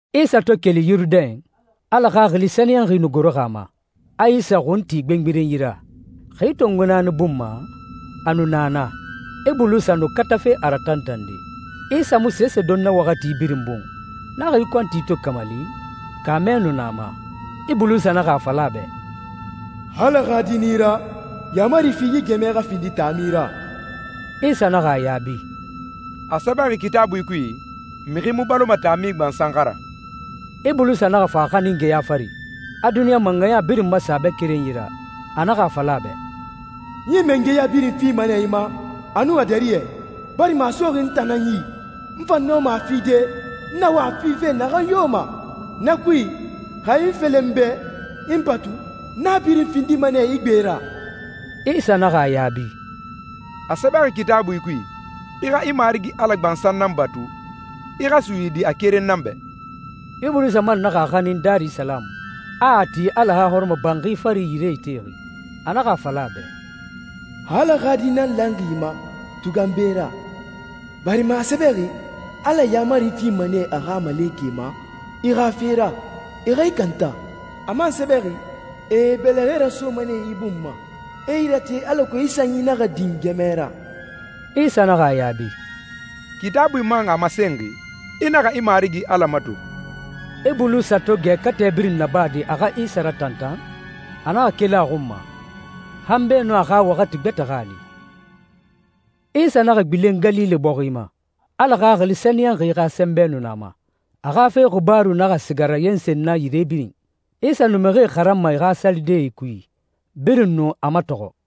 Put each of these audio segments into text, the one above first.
Isa to keli Yurudɛn, Ala Xaxili Sɛniyɛnxi nu goroxi a ma, a Isa xun ti gbengberenyi ra. Xi tongo naani bun ma, a nu na naa, Ibulisa nu katafe a ratantande. Isa mu sese don na waxati birin bun. Na xi kɔnti to kamali, kaamɛ nu na a ma. Ibulisa naxa a fala a bɛ, «Xa Ala xa Di nan i ra, yaamari fi yi gɛmɛ xa findi taami ra.» Isa naxa a yaabi, «A sɛbɛxi Kitaabui kui, ‹Mixi mu baloma taami gbansan xa ra.›» Ibulisa naxa fa a xanin geya fari, a duniɲa mangɛya birin masen a bɛ kerenyi ra. A naxa a fala a bɛ, «N yi mangɛya birin fima nɛ i ma a nun a dariyɛ, barima a soxi n tan nan yi. N fan nɔma a fide, n na wa a fife naxan yo ma. Na kui, xa i i felen n bɛ, i n batu, n a birin findima nɛ i gbe ra.» Isa naxa a yaabi, «A sɛbɛxi Kitaabui kui, ‹I xa i Marigi Ala gbansan nan batu, i xa suyidi a keren nan bɛ.›» Ibulisa man naxa a xanin Darisalamu, a a ti Ala xa hɔrɔmɔbanxi fari, yire itexi. A naxa a fala a bɛ, «Xa Ala xa Di nan lanxi i ma, tugan be ra, barima a sɛbɛxi, ‹Ala yaamari fima nɛ a xa malekɛe ma i xa fe ra, e xa i kanta.› A man sɛbɛxi, ‹E e bɛlɛxɛe rasoma nɛ i bun ma, e i rate alako i sanyi naxa din gɛmɛ ra.›» Isa naxa a yaabi, «Kitaabui man a masenxi, ‹I naxa i Marigi Ala mato.›» Ibulisa to gɛ katɛ birin nabade a xa Isa ratantan, a naxa keli a xun ma, han beenun a xa waxati gbɛtɛ xa a li. Isa naxa gbilen Galile bɔxi ma. Ala Xaxili Sɛniyɛnxi xa sɛnbɛ nu na a ma. A xa fe xibaaru naxa siga rayensen na yire birin. Isa nu mixie xaranma e xa salidee kui, birin nu a matɔxɔ.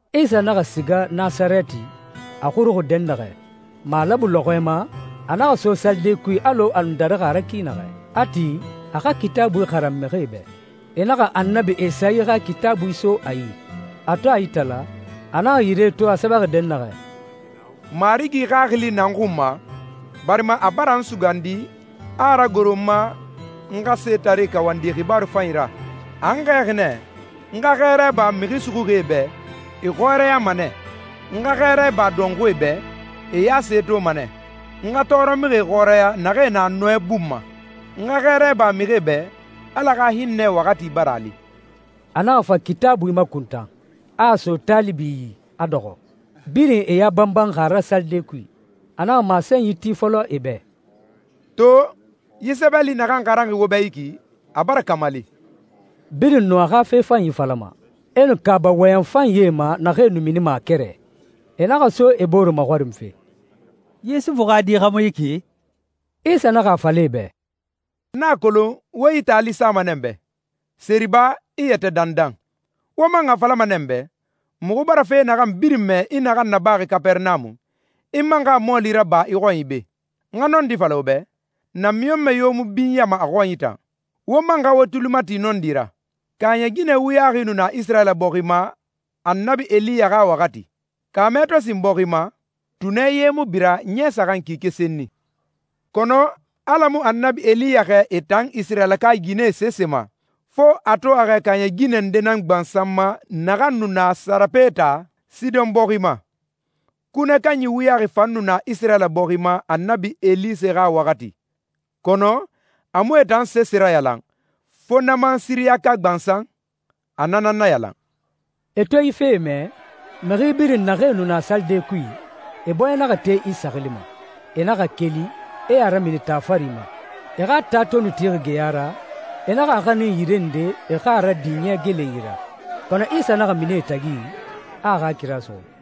Isa naxa siga Nasarɛti, a xuruxi dɛnnaxɛ. Malabu lɔxɔɛ ma, a naxa so salide kui alɔ a nu darixi a ra ki naxɛ, a ti, a xa Kitaabui xaran mixie bɛ. E naxa Annabi Esayi xa Kitaabui so a yi. A to a itala, a naxa yire to a sɛbɛxi dɛnnaxɛ, «Marigi Xaxili na n xun ma, barima a bara n sugandi, a a ragoro n ma, n xa setaree kawandi xibaaru fanyi ra. A n xɛɛxi nɛ n xa xɛɛra iba mixi suxuxie bɛ, e xɔrɛyama nɛ, n xa xɛɛra iba dɔnxuie bɛ, e ya se toma nɛ, n xa tɔɔrɔmixie xɔrɛya naxee na nɔɛ bun ma, n xa xɛɛra iba mixie bɛ, Ala xa hinnɛ waxati bara a li.» A naxa fa Kitaabui makuntan, a a so taalibi yi, a dɔxɔ. Birin e ya banbanxi a ra salide kui. A naxa masenyi ti fɔlɔ e bɛ, «To, yi sɛbɛli naxan xaranxi wo bɛ yi ki, a bara kamali.» Birin nu a xa fe fanyi falama, e nu kaaba wɔyɛn fanyie ma naxee nu minima a kɛrɛ i. E naxa so e bore maxɔrinfe, «Yusufu xa di xa mu yi ki?» Isa naxa a fala e bɛ, «N na a kolon wo yi taali sama nɛ n bɛ, ‹Seriba, i yɛtɛ dandan.› Wo man a falama nɛ n bɛ, ‹Muxu bara fe naxan birin mɛ i naxan nabaxi Kapɛrɛnamu, i man xa a mɔɔli raba i xɔnyi be.› N xa nɔndi fala wo bɛ, namiɲɔnmɛ yo mu binyama a xɔnyi tan. Wo man xa wo tuli ti nɔndi ra. Kaaɲɛ ginɛ wuyaxi nu na Isirayila bɔxi ma Annabi Eliya xa waxati, kaamɛ to sin bɔxi ma, tunɛ ye mu bira ɲɛ saxan kike senni. Kɔnɔ Ala mu Annabi Eliya xɛɛ e tan Isirayilaka ginɛe sese ma, fo a to a xɛɛ kaaɲɛ ginɛ nde nan gbansan ma naxan nu na Sarepeta, Sidɔn bɔxi ma. Kunɛ kanyi wuyaxi fan nu na Isirayila bɔxi ma Annabi Elise xa waxati, kɔnɔ a mu e tan sese rayalan, fo Naaman Siriyaka gbansan, a na nan nayalan.» E to yi fee mɛ, mixi birin naxee nu na salide kui, e bɔɲɛ naxa te Isa xili ma. E naxa keli, e a ramini taa fari ma. E xa taa to nu tixi geya ra, e naxa a xanin yire nde e xa a radin yɛ gelenyi ra. Kɔnɔ Isa naxa mini e tagi, a a xa kira suxu.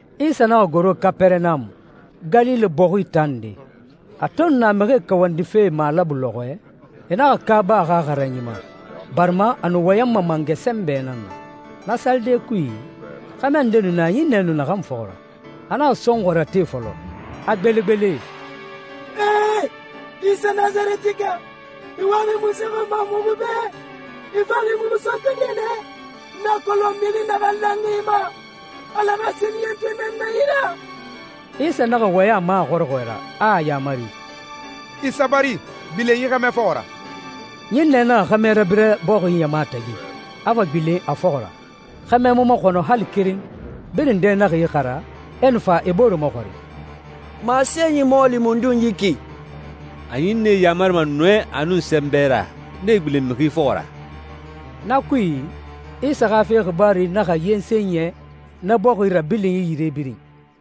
Isa naxa goro Kapɛrɛnamu, Galile bɔxi taa nde. A to nu na mixie kawandife malabu lɔxɔɛ, e naxa kaaba a xa xaranyi ma, barima a nu wɔyɛnma mangɛ sɛnbɛ nan na. Na salide kui, xɛmɛ nde nu na ɲinnɛ nu naxan fɔxɔ ra. A naxa sɔnxɔɛ rate fɔlɔ, a gbelegbele, «Ee! Isa Nasarɛtika, i waxi munse xɔn ma muxu bɛ? I faxi muxu sɔntɔde nɛ? N na a kolon mixi naxan lanxi i ma. Ala xa Sɛniyɛntɔɛ nan na i ra.» Isa naxa wɔyɛn a ma a xɔrɔxɔɛ ra, a a yamari, «I sabari. Gbilen yi xɛmɛ fɔxɔ ra.» Ɲinnɛ naxa xɛmɛ rabira bɔxi ɲama tagi, a fa gbilen a fɔxɔ ra. Xɛmɛ mu maxɔnɔ hali keren. Birin dɛ naxa ixara, e nu fa e bore maxɔrin, «Masenyi mɔɔli mundun yi ki? A ɲinnɛe yamarima nɔɛ nun sɛnbɛ ra, nee gbilen mixi fɔxɔ ra!» Na kui, Isa xa fe xibaaru naxa yensen yɛ na bɔxi rabilinyi yire birin.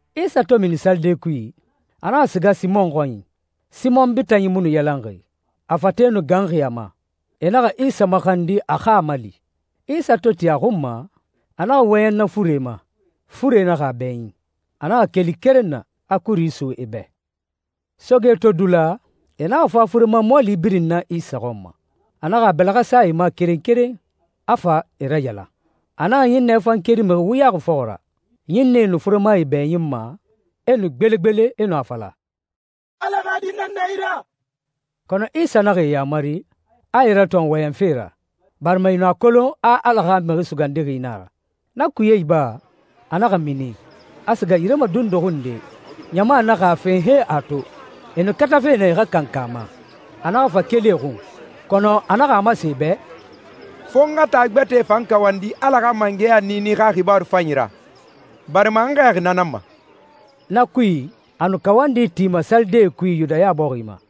Isa to mini salide kui, a naxa siga Simɔn xɔnyi. Simɔn bitanyi mu nu yalanxi. A fate nu ganxi a ma. E naxa Isa maxandi a xa a mali. Isa to ti a xun ma, a naxa wɔyɛn na fure ma, fure naxa a bɛɲin. A naxa keli keren na, a kuri so e bɛ. Soge to dula, e naxa fa furema mɔɔli birin na Isa xɔn ma. A naxa a bɛlɛxɛ sa e ma keren keren, a fa e rayalan. A naxa ɲinnɛe fan keri mixi wuyaxi fɔxɔ ra. Ɲinnɛe nu furemae bɛɲinma, e nu gbelegbele e nu a fala, «Ala xa Di nan na i ra!» Kɔnɔ Isa naxa e yamari, a e ratɔn wɔyɛnfe ra, barima e nu a kolon a Ala xa Mixi Sugandixi nan a ra. Na kuye iba, a naxa mini, a siga yire madunduxi nde. Ɲama naxa a fen han e a to. E nu katafe nɛ e xa kankan a ma, a naxa fa keli e xun. Kɔnɔ a naxa a masen e bɛ, «Fo n xa taa gbɛtɛe fan kawandi Ala xa mangɛya niini xa xibaaru fanyi ra, barima n xɛɛxi na nan ma.» Na kui, a nu kawandi tima salidee kui Yudaya bɔxi ma.